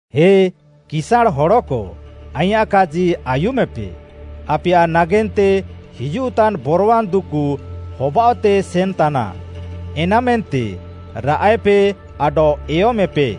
ହେ କିସାଁଣ୍‌ ହଡ଼କ ଆଇଁୟାଃ କାଜି ଆୟୁମେପେ, ଆପେୟାଃ ନାଗେନ୍ତେ ହିଜୁଃତାନ୍‌ ବରୱାନ୍‌ ଦୁକୁ ହବାଅଃତେ ସେନ୍‌ତାନା, ଏନାମେନ୍ତେ ରାଆଃଏପେ ଆଡଃ ଏୟମେପେ।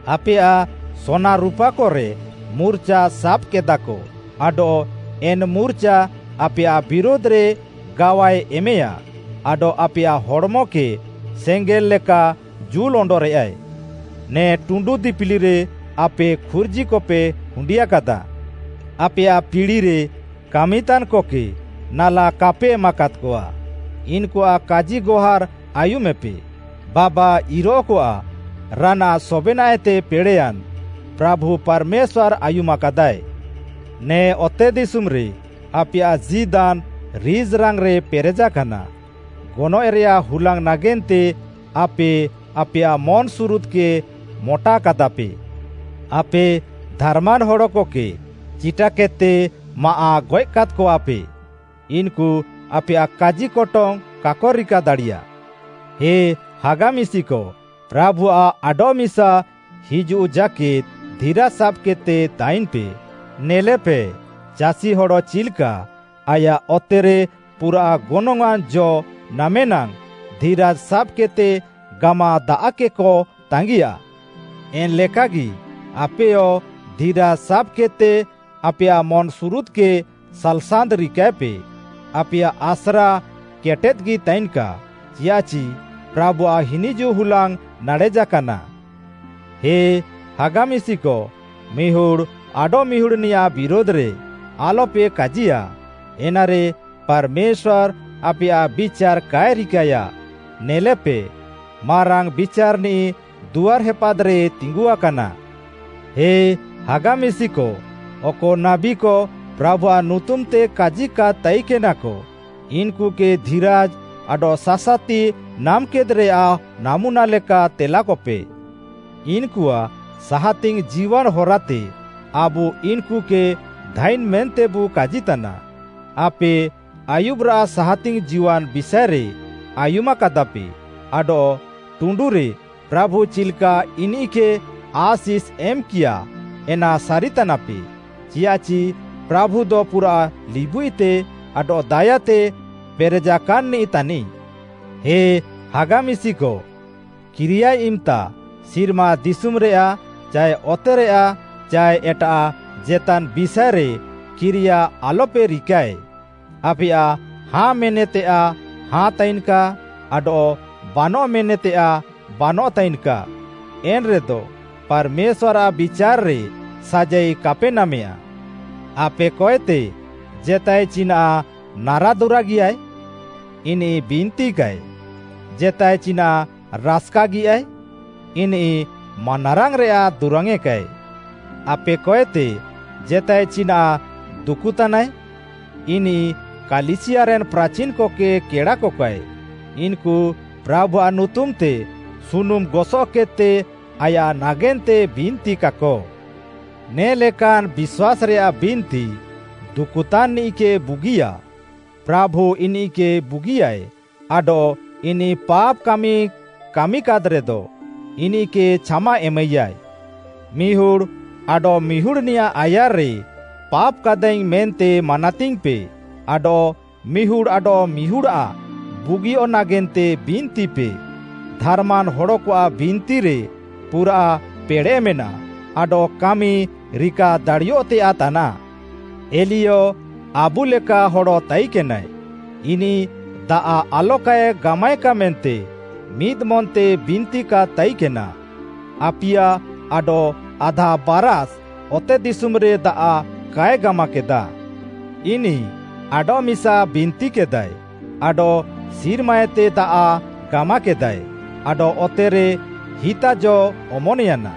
ଆପେୟାଃ ସୋନା ରୁପାକରେ ମୁର୍ଚା ସାବ୍‌କେଦାକ, ଆଡଃ ଏନ୍‌ ମୁର୍ଚା ଆପେୟାଃ ବିରୁଧ୍‌ରେ ଗାୱାଏ ଏମେୟା ଆଡଃ ଆପେୟାଃ ହଡ଼୍‌ମକେ ସେଙ୍ଗେଲ୍‌ ଲେକା ଜୁଲ୍‌ ଅଣ୍ଡରେଆଏ। ନେ ଟୁଣ୍ଡୁ ଦିପିଲିରେ ଆପେ ଖୁର୍ଜିକପେ ହୁଣ୍ଡିଆକାଦା। ଆପେୟାଃ ପିଡ଼ିରେ କାମିତାନ୍‌କକେ ନାଲା କାପେ ଏମାକାଦ୍‌କଆ। ଇନ୍‌କୁଆଃ କାଜିଗହାର୍‌ ଆୟୁମେପେ। ବାବା ଇରଃକଆଃ ରାନାଃ ସବେନାଃଏତେ ପେଡ଼େଃୟାନ୍‌ ପ୍ରାଭୁ ପାର୍‌ମେଶ୍ୱାର୍‌ ଆୟୁମାକାଦାଏ। ନେ ଅତେଦିଶୁମ୍‌ରେ ଆପେୟାଃ ଜୀଦାନ୍‌ ରିଜ୍‌ରାଙ୍ଗ୍‌ରେ ପେରେଜାକାନା। ଗନଏଃରେୟାଃ ହୁଲାଙ୍ଗ୍‌ ନାଗେନ୍ତେ ଆପେ ଆପେୟାଃ ମନ୍‌ସୁରୁଦ୍‌କେ ମଟାକାଦାପେ। ଆପେ ଧାର୍‌ମାନ୍‌ ହଡ଼କକେ ଚିଟାକେଦ୍‌ତେ ମାଆଃଗଏଃ କାଦ୍‌କଆପେ; ଇନ୍‌କୁ ଆପେୟାଃ କାଜିକଟଙ୍ଗ୍‌ କାକ ରିକା ଦାଡ଼ିୟା। ହେ ହାଗା ମିଶିକ, ପ୍ରାଭୁଆଃ ଆଡଃମିସା ହିଜୁଃ ଜାକେଦ୍‌ ଧିରାଜ୍‌ ସାବ୍‌କେଦ୍‌ତେ ତାଇନ୍‌ପେ। ନେଲେପେ, ଚାଷିହଡ଼ ଚିଲ୍‌କା ଆୟାଃ ଅତେରେ ପୁରାଃ ଗନଙ୍ଗ୍‌ଆଁନ୍‌ ଜ ନାମେ ନାଙ୍ଗ୍‌ ଧିରାଜ୍‌ ସାବ୍‌କେଦ୍‌ତେ ଗାମାଦାଆଃକେକ ତାଙ୍ଗିଆ। ଏନ୍‌ଲେକାଗି ଆପେୟ ଧିରାଜ୍‌ ସାବ୍‌କେଦ୍‌ତେ ଆପେୟାଃ ମନ୍‌ସୁରୁଦ୍‌କେ ସାଲ୍‌ସାନ୍ତ୍‌ ରିକାଏପେ। ଆପେୟାଃ ଆସ୍ରା କେଟେଦ୍‌ଗି ତାଇନ୍‌କା, ଚିଆଃଚି ପ୍ରାଭୁଆଃ ହିନିଜୁଃ ହୁଲାଙ୍ଗ୍‌ ନାଡ଼େଜାକାନା। ହେ ହାଗା ମିଶିକ, ମିହୁଡ଼୍‌ ଆଡଃମିହୁଡ଼୍‌ନିୟାଃ ବିରୁଧ୍‌ରେ ଆଲପେ କାଜିୟା, ଏନାରେ ପାର୍‌ମେଶ୍ୱାର୍‌ ଆପେୟାଃ ବିଚାର୍‌ କାଏ ରିକାଏୟା। ନେଲେପେ, ମାରାଙ୍ଗ୍‌ ବିଚାର୍‌ନିଃ ଦୁଆର୍‌ ହେପାଦ୍‌ରେ ତିଙ୍ଗୁଆକାନା। ହେ ହାଗା ମିଶିକ, ଅକ ନାବୀକ ପ୍ରାଭୁଆଃ ନୁତୁମ୍‌ତେ କାଜିକାଦ୍‌ ତାଇକେନାକ, ଇନ୍‌କୁକେ ଧିରାଜ୍‌ ଆଡଃ ସାସାତି ନାମେକେଦ୍‌ରେୟାଃ ନାମୁନା ଲେକା ତେଲାକପେ। ଇନ୍‌କୁଆଃ ସାହାତିଙ୍ଗ୍‌ ଜୀୱାନ୍‌ ହରାତେ ଆବୁ ଇନ୍‌କୁକେ ଧାଇନ୍‌ ମେନ୍ତେବୁ କାଜିତାନା। ଆପେ ଆୟୁବ୍‌ରାଃ ସାହାତିଙ୍ଗ୍‌ ଜୀୱାନ୍‌ ବିଷାଏରେ ଆୟୁମାକାଦାପେ ଆଡଃ ଟୁଣ୍ଡୁରେ ପ୍ରାଭୁ ଚିଲ୍‌କା ଇନିଃକେ ଆଶିଷ୍‌ ଏମ୍‌କିୟାଏ, ଏନା ସାରିତାନାପେ। ଚିୟାଃଚି ପ୍ରାଭୁଦ ପୁରା ଲିବୁଇତେ ଆଡଃ ଦାୟାତେ ପେରେଜାକାନ୍‌ନିଃ ତାନିଃ। ହେ ହାଗା ମିଶିକ, କିରିୟାଏ ଇମ୍‌ତା ସିର୍ମା ଦିଶୁମ୍‌ରେୟାଃ ଚାଏ ଅତେରେୟାଃ ଚାଏ ଏଟାଃ ଜେତାନ୍‌ ବିଷାଏରେ କିରିୟା ଆଲପେ ରିକାଏ। ଆପେୟାଃ “ହଁ” ମେନ୍‌ତେୟାଃ ହଁ ତାଇନ୍‌କା ଆଡଃ “ବାନଃ” ମେନ୍‌ତେୟାଃ ବାନଃ ତାଇନ୍‌କା। ଏନ୍‌ରେଦ ପାର୍‌ମେଶ୍ୱାର୍‌ଆଃ ବିଚାର୍‌ରେ ସାଜାଇ କାପେ ନାମେୟା। ଆପେକଏତେ ଜେତାଏ ଚିନାଃ ନାରାଦୁରାଗିୟାଏ? ଇନିଃ ବିନ୍ତିକାଏ। ଜେତାଏ ଚିନାଃ ରାସ୍‌କାଗିୟାଏ? ଇନିଃ ମାନାରାଙ୍ଗ୍‌ରେୟାଃ ଦୁରାଙ୍ଗେକାଏ। ଆପେକଏତେ ଜେତାଏ ଚିନାଃ ଦୁକୁତାନାଏ? ଇନିଃ କାଲିସିୟାରେନ୍‌ ପ୍ରାଚିନ୍‌କକେ କେଡ଼ାକକାଏ; ଇନ୍‌କୁ ପ୍ରାଭୁଆଃ ନୁତୁମ୍‌ତେ ସୁନୁମ୍‌ ଗସଃକେଦ୍‌ତେ ଆୟାଃ ନାଗେନ୍ତେ ବିନ୍ତିକାକ। ନେ'ଲେକାନ୍‌ ବିଶ୍ୱାସ୍‌ରେୟାଃ ବିନ୍ତି ଦୁକୁତାନ୍‌ନିଃକେ ବୁଗିୟା। ପ୍ରାଭୁ ଇନିଃକେ ବୁଗିୟାଏ ଆଡଃ ଇନିଃ ପାପ୍‌ କାମିକାଦ୍‌ରେଦ, ଇନିଃକେ ଛାମା ଏମାଇୟାଏ। ମିହୁଡ଼୍‌ ଆଡଃମିହୁଡ଼୍‌ନିୟାଃ ଆୟାର୍‌ରେ ପାପ୍‌କାଦାଇଙ୍ଗ୍‌ ମେନ୍ତେ ମାନାତିଙ୍ଗ୍‌ପେ ଆଡଃ ମିହୁଡ଼୍‌ ଆଡଃମିହୁଡ଼୍‌ଆଃ ବୁଗିୟଃ ନାଗେନ୍ତେ ବିନ୍ତିପେ। ଧାର୍‌ମାନ୍‌ ହଡ଼କଆଃ ବିନ୍ତିରେ ପୁରାଃ ପେଡ଼େଃମେନା ଆଡଃ କାମି ରିକା ଦାଡ଼ିୟଃତେୟାଃ ତାନାଃ। ଏଲିୟ ଆବୁଲେକା ହଡ଼ ତାଇକେନାଏ। ଇନିଃ ଦାଆଃ ଆଲକାଏ ଗାମାଏକା ମେନ୍ତେ ମିଦ୍‌ମନ୍‌ତେ ବିନ୍ତିକାଦ୍ ତାଇକେନା, ଆପିୟା ଆଡଃ ଆଧା ବାରାଷ୍‌ ଅତେଦିଶୁମ୍‌ରେ ଦାଆଃ କାଏ ଗାମାକେଦା। ଇନିଃ ଆଡଃମିସା ବିନ୍ତିକେଦାଏ, ଆଡଃ ସିର୍ମାଏତେ ଦାଆଃ ଗାମାକେଦାଏ, ଆଡଃ ଅତେରେ ହିତା ଜ ଅମନ୍‌ୟାନା।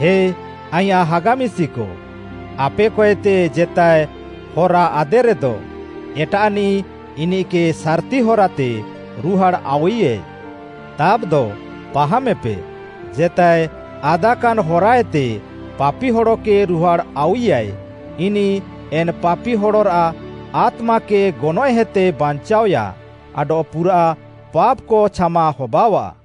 ହେ ଆଇଁୟାଃ ହାଗା ମିଶିକ, ଆପେକଏତେ ଜେତାଏ ହରା ଆଦେରେଦ, ଏଟାଃନିଃ ଇନିଃକେ ସାର୍‌ତି ହରାତେ ରୁହାଡ଼୍‌ ଆଉଇୟାଏ। ତାବ୍‌ଦ ପାହାମେପେ, ଜେତାଏ ଆଦାକାନ୍‌ ହରାଏତେ ପାପି ହଡ଼କେ ରୁହାଡ଼୍‌ ଆଉଇୟାଏ, ଇନିଃ ଏନ୍‌ ପାପି ହଡ଼ରାଃ ଆତ୍ମାକେ ଗନଏଃହେତେ ବାଞ୍ଚାଅୟା ଆଡଃ ପୁରାଃ ପାପ୍‌କ ଛାମା ହବାଅଃଆ।